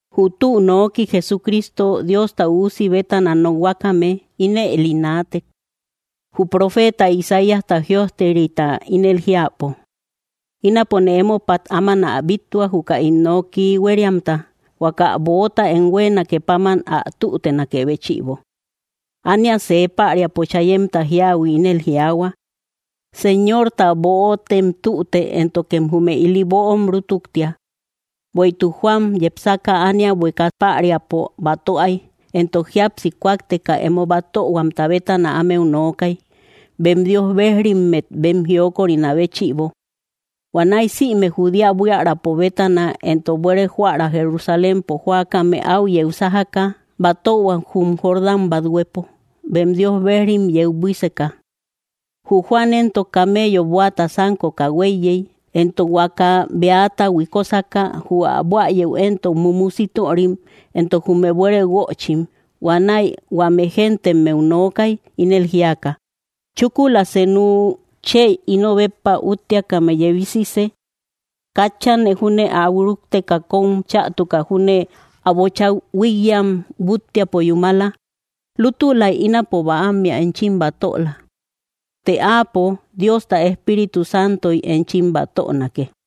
Jü tü nooki Jesucristo Diosta Üusi bétana nokhuakame ínëli naatek. Jü profeta Isaíasta jïojterita ínel jiäpo: Ínapone émopat áman ä bíttua, juka ín noki huériamta, huaka böota em huéenake páman ä tütenakë béchïbo. Ánia see päriapo chayemta jíahui ínel jiaahua: “Señorta böotem tüte; éntokem jume ili böom rútuktia.” Bueïtuk, Juan, yepsaka ánia buéeka päriapo batöay, entok jíapsi kúakteka emo batöhuamta bétana ámeu nookay, bem Dios bejrimmet bem jiokorinä béchïbo. Huanäi sïme Judea buiärapo bétana entok buere joära Jerusalémpo jóakame áu yeu sájaka batöhuak jum Jordán bathuepo, bem Dios bejrim yeu buíseka. Jü Juan éntok, camello bóata sánkoka huéiyey, entok huaka beata huikosaka. Jü ä buäyeu éntok mumu sítörim entok jume buere guöchim. Huanäi huame géntemmeu nookay, ínel jíaka: —Chúkula senu chë ino béppa útteakame yebisisë. Katchane júne áu rúkteka, kóm chätuka júne, ä bocha huíkyam búttiapo yúmala. Lútulay ínapo bäammea enchim batöla; të Áapo Diosta Espíritu Santoy enchim batönake.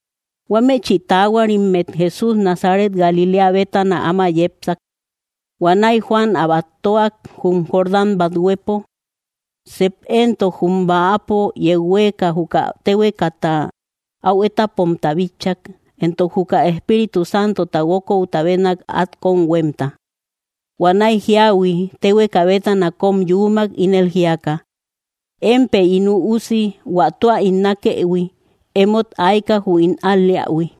Huámechï taahuarimmet Jesús Nazaret Galiléa bétana áma yepsak. Huanäi Juan ä batöak jum Jordán bathuepo. Sep éntok jum bäapo yeu huéeka, juka téhuekata au étapomta bitchak, entok juka Espíritu Santota guókouta bénnak at kóm huémta. Huanäi jíahui téhueka bétana kóm yuumak, ínel jíaka: —Empë ín Üusi huä tua ín nákëhui; émot ayka jü ín al‑leähui.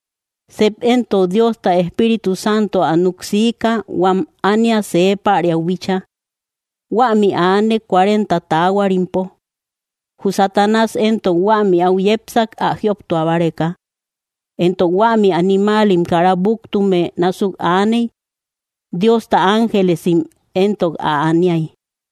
Sep éntok Diosta Espíritu Santo ä núk siika huam ánia see päriau bíchaa. Huämi aanek cuarenta taahuarimpo. Jü Satanás éntok huämi au yepsak ä jioptua báreka. Entok huämi animaalim kara búktume násuk aaney. Diosta ángelesim éntok ä aniay.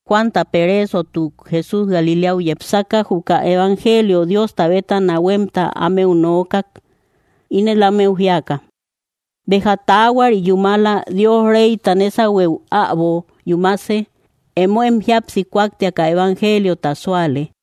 Juanta pereesotuk, Jesús Galiléau yepsaka juka evangelio Diosta bétana huemta ámeu nookak, ínel ámeu jíaka: —Béja taahuari yúmala; Dios reyta nésahueu äbo yúmase. Emóem jíapsi kúaktiaka evangeliota súale.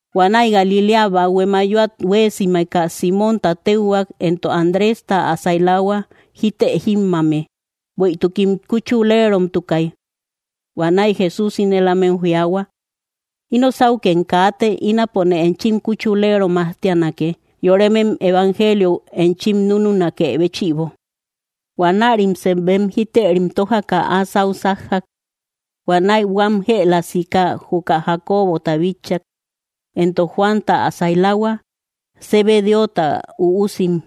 Huanäi Galiléa bahue mayoat huéesimeka, Símonta téuhuak entok Andrésta ä sailahua jítë jímmame; bueïtukim kuchuleromtukay. Huanäi Jesús ínel ámeu jiaahua: —Ino sáukem kaate. Ínapone enchim kuchulero majtianake, yoremem evangeliou enchim núnunakë béchïbo. Huanärim sep bem jítërim tójaka, áa sáu sájjak. Huanäi huam jëla sika juka Jacobota bitchak, entok Juanta ä sailahua, Zebedeota üusim.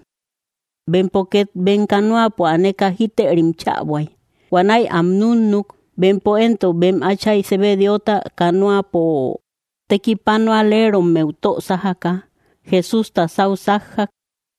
Bempo ket bem canoapo aneka jítërim chäbuay. Huanäi am núnnuk. Bempo éntok bem átchay Zebedeota canoapo tekipanualerommeu tö sájaka, Jessústa sáu sájjak.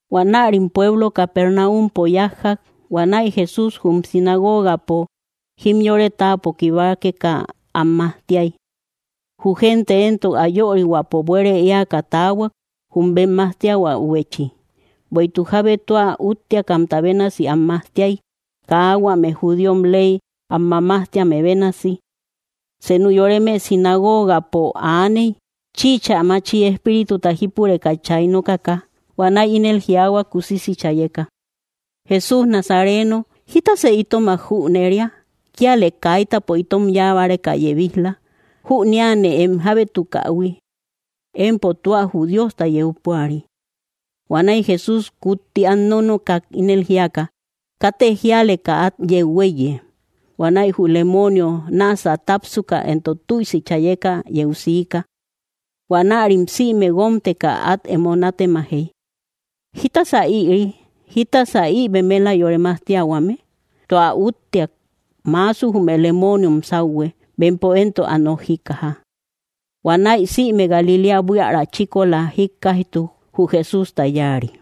Huanärim pueblo Capernaumpo yájjak. Huanäi Jesús jum sinagogapo jimyore táapo kibakeka, am majtiay. Jü gente éntok ä yörihuäpo buere éaka taahuak, jü bem majtiahuäubechi, bueïtuk jábe tua útteakamta bénasi am majtiay, kaa huame judíom ley am mamajtíame bénasi. Senu yoreme sinagogapo aaney, chïcha machi espírituta jípureka chay nokaka. Huanäi ínel jiaahua kusisi chayeka: —Jesús Nazareno, ¿jítasë itomak jüneria? ¿Kíalë kaitäpo itom yáa báreka yebij‑la? Jüneane em jábétukähui. Empo tua jü Diosta yeu púari. Huanäi Jesús kutti át nónookak, ínel jíaka: —Katë jíaleka át yeu huéiye. Huanäi jü lemoonio náasä tápsuka entok tüisi chayeka yeu siika. Huanärim sïme guómteka, át emo nátemajey: —¿Jítasa ïri? ¿Jítasa ï bemela yore majtiahuame? ¡Tua útteak! Maasu jume lemooniom sáuhue, bempo éntok ä nok jíkkaja. Huanäi sïme Galiléa buiära chíkola jíkkaijtuk jü Jesústa yáari.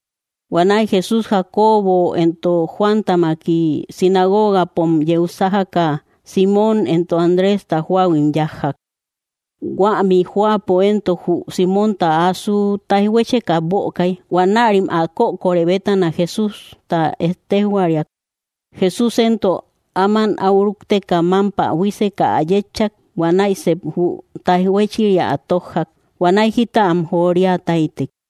Huanäi Jesús Jacobo entok Juántamaki, sinagogapom yeu sájaka, Simmom entok Andrésta jóahuim yájjak. Huämi jóapo éntok jü Símonta asu taijhuécheka bökay. Huanärim ä kökore bétana Jesústa ettejhuariak. Jesús éntok áman au rúkteka, mámpä buíseka ä yétchak. Huanäi sep jü taijhuéchiria ä tójjak; huanäi jita am joria táytek.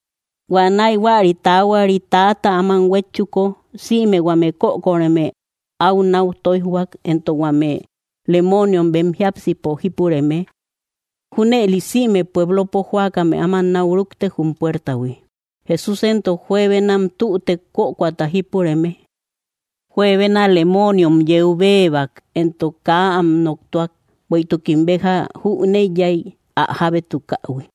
Huanäi huäri taahuarit täata áman huétchuko, sïme huame kökoreme áu nau tóijhuak, entok huame lemooniom bem jiápsipo jípureme. Júnëli sïme puéblopo jóakame áman nau rúktek jum puertahui. Jesús éntok juebenam tütek, kökoata jípureme. Juebena lemooniom yeu béebak, entok kaa am noktuak, bueïtukim béja jüneiyay ä jábétukähui.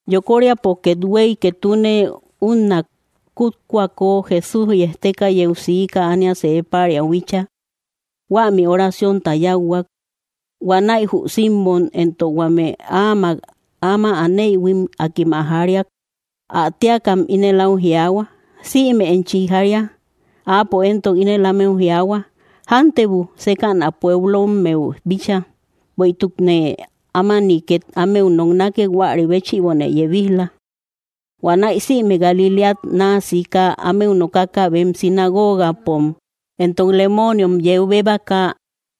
Yokoríapo kethuey, ketune unna kútkoako, Jesús yejteka yeu siika ánia see päriau bíchaa. Huämi oraciónta yáuhuak. Huanäi jü Simmom, entok huame áamak áma aneïhuim, akim ä jariak. Ä téakam ínel áu jiaahua: —Sïme enchi jaria. Áapo éntok ínel ámeu jiaahua: —Jántebu sékäna pueblommeu bíchaa, bueïtukne ámani ket ámeu noknake; huäri béchïbone yebij‑la. Huanäi sïme Galiléat naa siika ámeu nokaka bem sinagogapom, entok lemooniom yeu béebaka.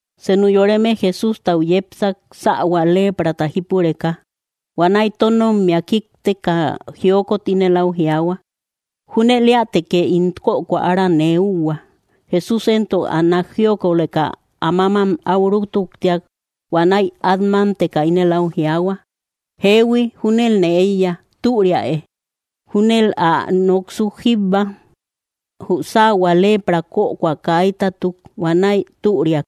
Senu yoreme Jesústau yepsak sähua leprata jípureka. Huanäi tónommia kíkteka jiokot ínel áu jiaahua: —Júnel éätekë ín kökoa ára nee úhua. Jesús éntok ä nák jiokoleka, ä mámam áu rútuktiak. Huanäi át mámteka ínel au jiaahua: —Jeehui, júnelne éiya; türiäe. Júnel ä noksuk jíbba, jü sähua lepra kökoa kaitatuk; huanäi türiak.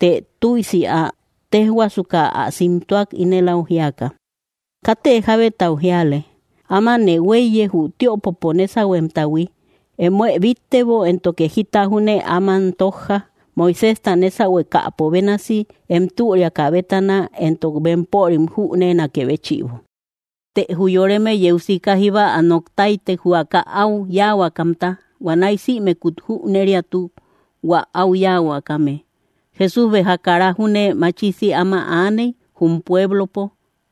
Të tüisi ä téjhuasuka ä simtuak, ínel áu jíaka: —Katë jábetau jíale. Ámanë huéiye jü tiöpopo nésauhuemtahui. Emoë bíttebo, éntoke jita júne áman tójja, Moiséjta nésahuekäpo bénasi, em türiakä bétana, entok bempörim jüneenakë béchïbo. Të jü yoreme yeu sika jíba ä nok táytek, huaka áu yáahuakamta. Huanäi sïmekut jüneriatuk hua áu yáahuakame. Jesús béja kara júne machisi áma aaney, jum pueblopo.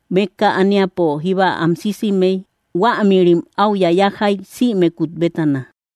Mékka ániapo jíba an sísimey. Huáamïrim áu yayajay sïmekut bétana.